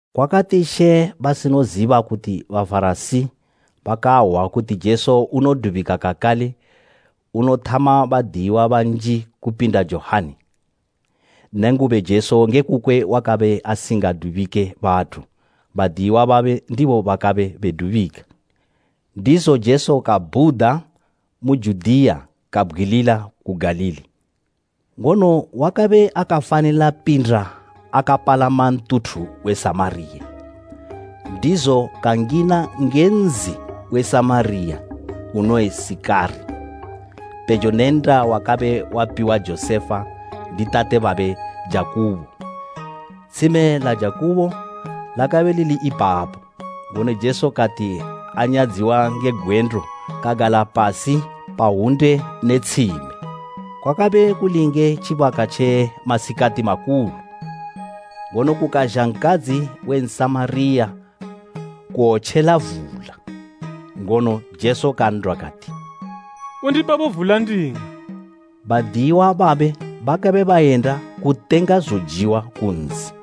Kwakati Jesu asinoziba kuti Bafarasi bakahwa kuti unodubika kakale unothama badiyiwa banji kupinda Johani, (nenguba, Jesu nge kukwe akabe asingadubike bathu, badiyiwa babe ndibo bakabe bedubika.) Ndizo Jesu kabhuda mu Judiya kabgwilila ku Galili. Ngono wakabe akafanila pinda akapalama ntuthu we Samariya. Ndizo kangina nge nzi we Samariya unoyi Sikari, pejo ne nnda wakabe wapiwa Josefa ndi tate babe Jakubo. Tshime la Jakubo lakabe lili ipapo, ngono Jesu kati anyadziwa nge gwendo kagala pasi pa hwunde ne tshime. Kwakabe kuli nge tjibaka tje masikati makulu. Ngono kukazha nkadzi we Nsamariya kuwotjela vula, ngono Jesu kan'dwa kati, “Undipebo vula nding'we.” Badiyiwa babe bakabe bayenda kutenga zojiwa ku nzi.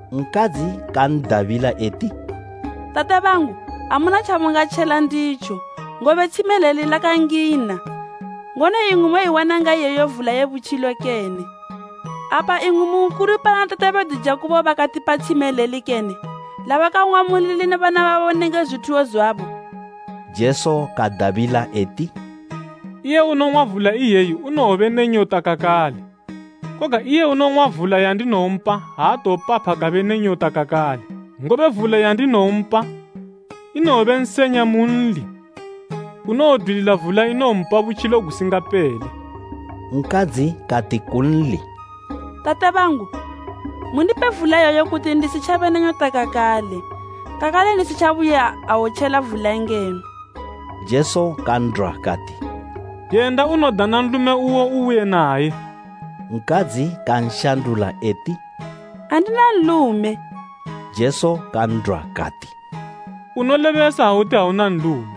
Nkadzi kan'dabila eti, “Tate bangu, amuna tjamungatjela nditjo, ngobe tshime ileli lakangina, ngono imwi moiwana ngayi iyeyo vula ye butjilo kene? Apa imwi mu nkulu pana tate bedu Jakubo bakatipa tshime ileli kene, labakang'wa mulili ne bana babo nenge zwithuwo zwabo?” Jesu kadabila eti, “Iye unong'wa vula iyeyi unowobe ne nyota kakale, koga iye unowong'wa vula yandinowompa aatowopapha kabe ne nyota kakale. Ngobe vula yandinowompa, inowobe nsenya munli unowodwilila vula inowompa butjilo gusingapele.” Nkadzi kati kunli, “Tate bangu, mundipe vula iyeyo kuti ndisitjabe ne nyota kakale, kakale ndisitjabuye awotjela vula ngeno.” Jesu kan'dwa kati, “Yenda unodana nlume uwo ubuye naye.” Nkadzi kanshandula eti, “Andina nlume.” Jesu kan'dwa kati, “Unolebesa ha uti auna nlume.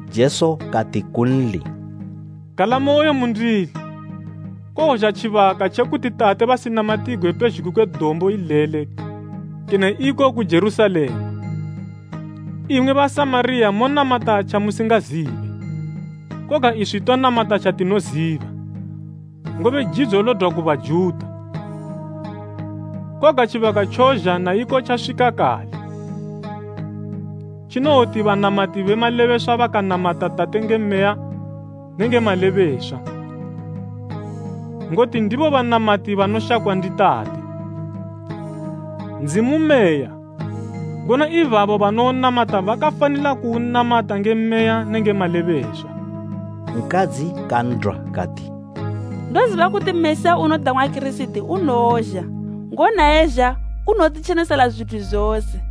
Jesu kati kunli, “Galamoyo mundili, kowozha tjibaka tje kuti Tate basinamatigwe pezhugwi kwe dombo ileli kene iko ku Jerusalema. Imwi Basamariya monamata tjamusingazibe, koga iswi tonamata tjatinoziba, ngobe jidzo lodwa ku Bajuta. Koga tjibaka tjozha, naiko tjaswika kale, tjinowoti banamati be malebeswa bakanamata Tate nge Meya ne nge malebeswa, ngoti ndibo banamati banoshakwa ndi Tate. Ndzimu Meya, ngono ibabo banounamata bakafanila kuunamata nge Meya nenge malebeswa.” Nkadzi kan'dwa kati, “Ndoziba kuti Mesiya, unodang'wa Kirisiti unowozha, ngono ha ezha unowotitjenesela zwithu zose.”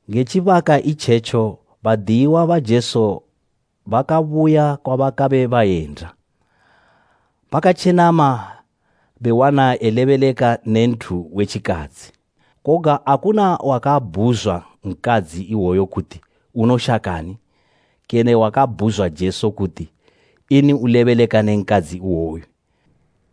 Nge tjibaka itjetjo badiyiwa ba Jesu bakabuya kwabakabe bayenda, bakatjenama bewana elebeleka ne nthu we tjikadzi. Koga akuna wakabhuzwa nkadzi iwoyo kuti, “Unoshakani?” Kene wakabhuzwa Jesu kuti, “Ini ulebeleka ne nkadzi iwoyo?”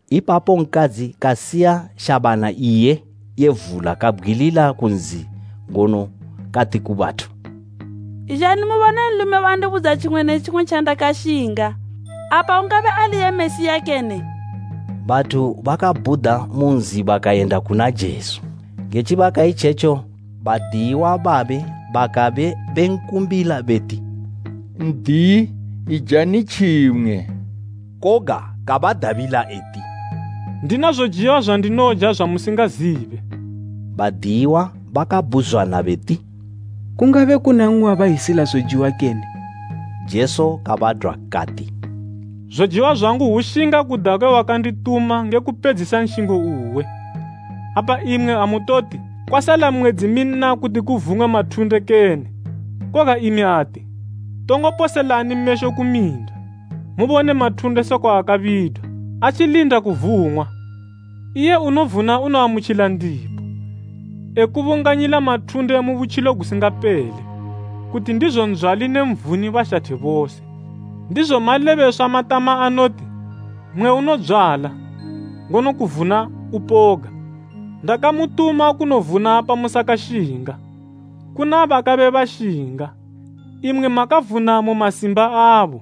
Ipapo nkadzi kasiya shabana iye ye vula kabgwilila ku nzi ngono kati ku bathu, “Izhani mubone nlume wandibudza tjimwe ne tjimwe tjandakashinga. Apa ungabe ali iye Mesiya kene?” Bathu bakabhuda mu nzi bakayenda kuna Jesu. Nge tjibaka itjetjo badiyiwa babe bakabe benkumbila beti, “N'diyi, ijani tjimwe!” Koga kabadabila eti, “Ndina zojiwa zwandinoja zwamusingazibe.” Badiyiwa bakabhuzwana beti, “Kungabe kuna mmwe wabazhisila zojiwa kene?” Jesu kabadwa kati, “Zojiwa zwangu hwushinga kuda kwe wakandituma nge kupedzisa nshingo uwe. Apa imwi amutoti, ‘Kwasala mwedzi minna kuti kuvung'we mathunde kene?’ Koga imi ati, tongo poselani mesho ku minda, mubone mathunde sekwa akabidwa, atjilinda kuvung'wa! Iye unovuna unoamutjila ndipo, ekubunganyila mathunde mu butjilo gusingapele, kuti ndizo ndzwali ne nvuni bashathe bose. Ndizo malebeswa matama anoti, ‘Mmwe unodzwala, ngono kovuna upoga.’ Ndakamutuma kunovuna pamusakashinga, kuna bakabe bashinga, imwi makavuna mu masimba abo.”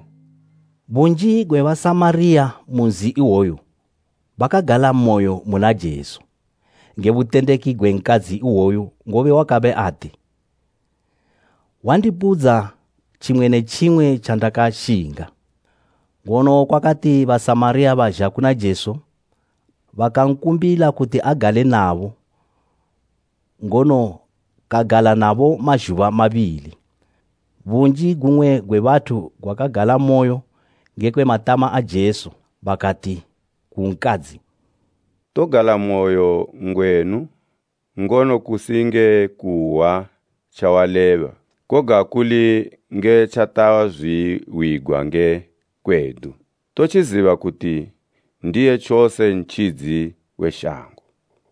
Bunji gwe Basamariya mu nzi iwoyo bakagalamoyo muna Jesu, nge butendeki gwe nkadzi iwoyu ngobe wakabe ati, “Wandibudza tjimwe ne tjimwe tjandakashinga.” Ngono kwakati Basamariya bazha kuna Jesu, bakankumbila kuti agale nabo, ngono kagala nabo mazhuba mabili. Bunji gumwe gwe bathu gwakagalamoyo ngekwe matama a Jesu. Bakati ku nkadzi, “Togalamoyo ngwenu, ngono kusi nge kuhwa tjawaleba, koga kuli nge tjatazwihwigwa nge kwedu, totjiziba kuti ndiye tjose Ntjidzi we shango.”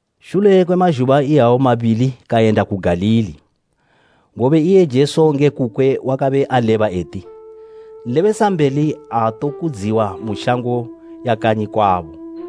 Shule kwe mazhuba iyawo mabili kayenda ku Galili, ngobe iye Jesu nge kukwe wakabe aleba eti, “Nlebesambeli aatokudziwa mu shango ya kanyi kwabo.”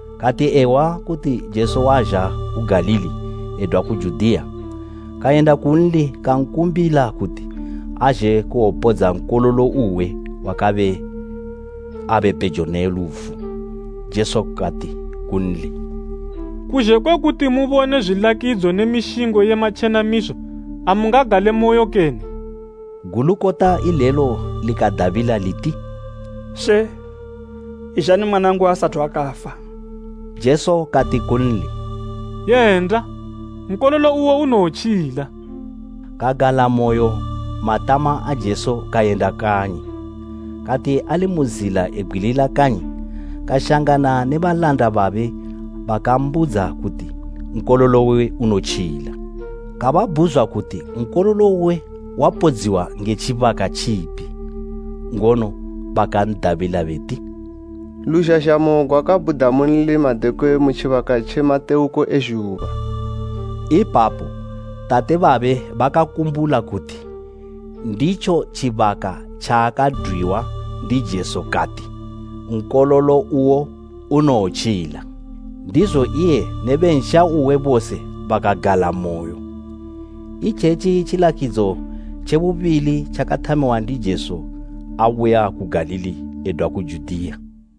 Kati ehwa kuti Jesu wazha ku Galili edwa ku Judiya, kayenda kunli kankumbila kuti azhe kuwopodza nkololo uwe wakabe abe pejo ne lufu. Jesu kati kunli “Kuzhe kwe kuti mubone zwilakidzo ne mishingo ye matjenamiso amungagalemoyo kene?” Gulukota ilelo likadabila liti, “She, izhani mwanangu asathu kafa.” Jesu kati kunli, “Yenda, nkololo uwo unowotjila!” Kagalamoyo matama a Jesu kayenda kanyi. Kati ali mu zila ebgwilila kanyi kashangana ne balanda babe bakambudza kuti nkololo uwe unotjila. Kababhuzwa kuti nkololo uwe wapodziwa nge tjibaka tjipi, ngono bakan'dabila beti, “Luzhazhamo gwakabhuda munli madekwe mu tjibaka tje matewuko e zhuba.” Ipapo tate babe bakakumbula kuti nditjo tjibaka tjaakadwiwa ndi Jesu kati, “Nkololo uwo unowotjila.” Ndizo iye ne be nsha uwe bose bakagalamoyo. Itjetji tjilakidzo tje bubili tjakathamiwa ndi Jesu abuya ku Galili edwa ku Judiya.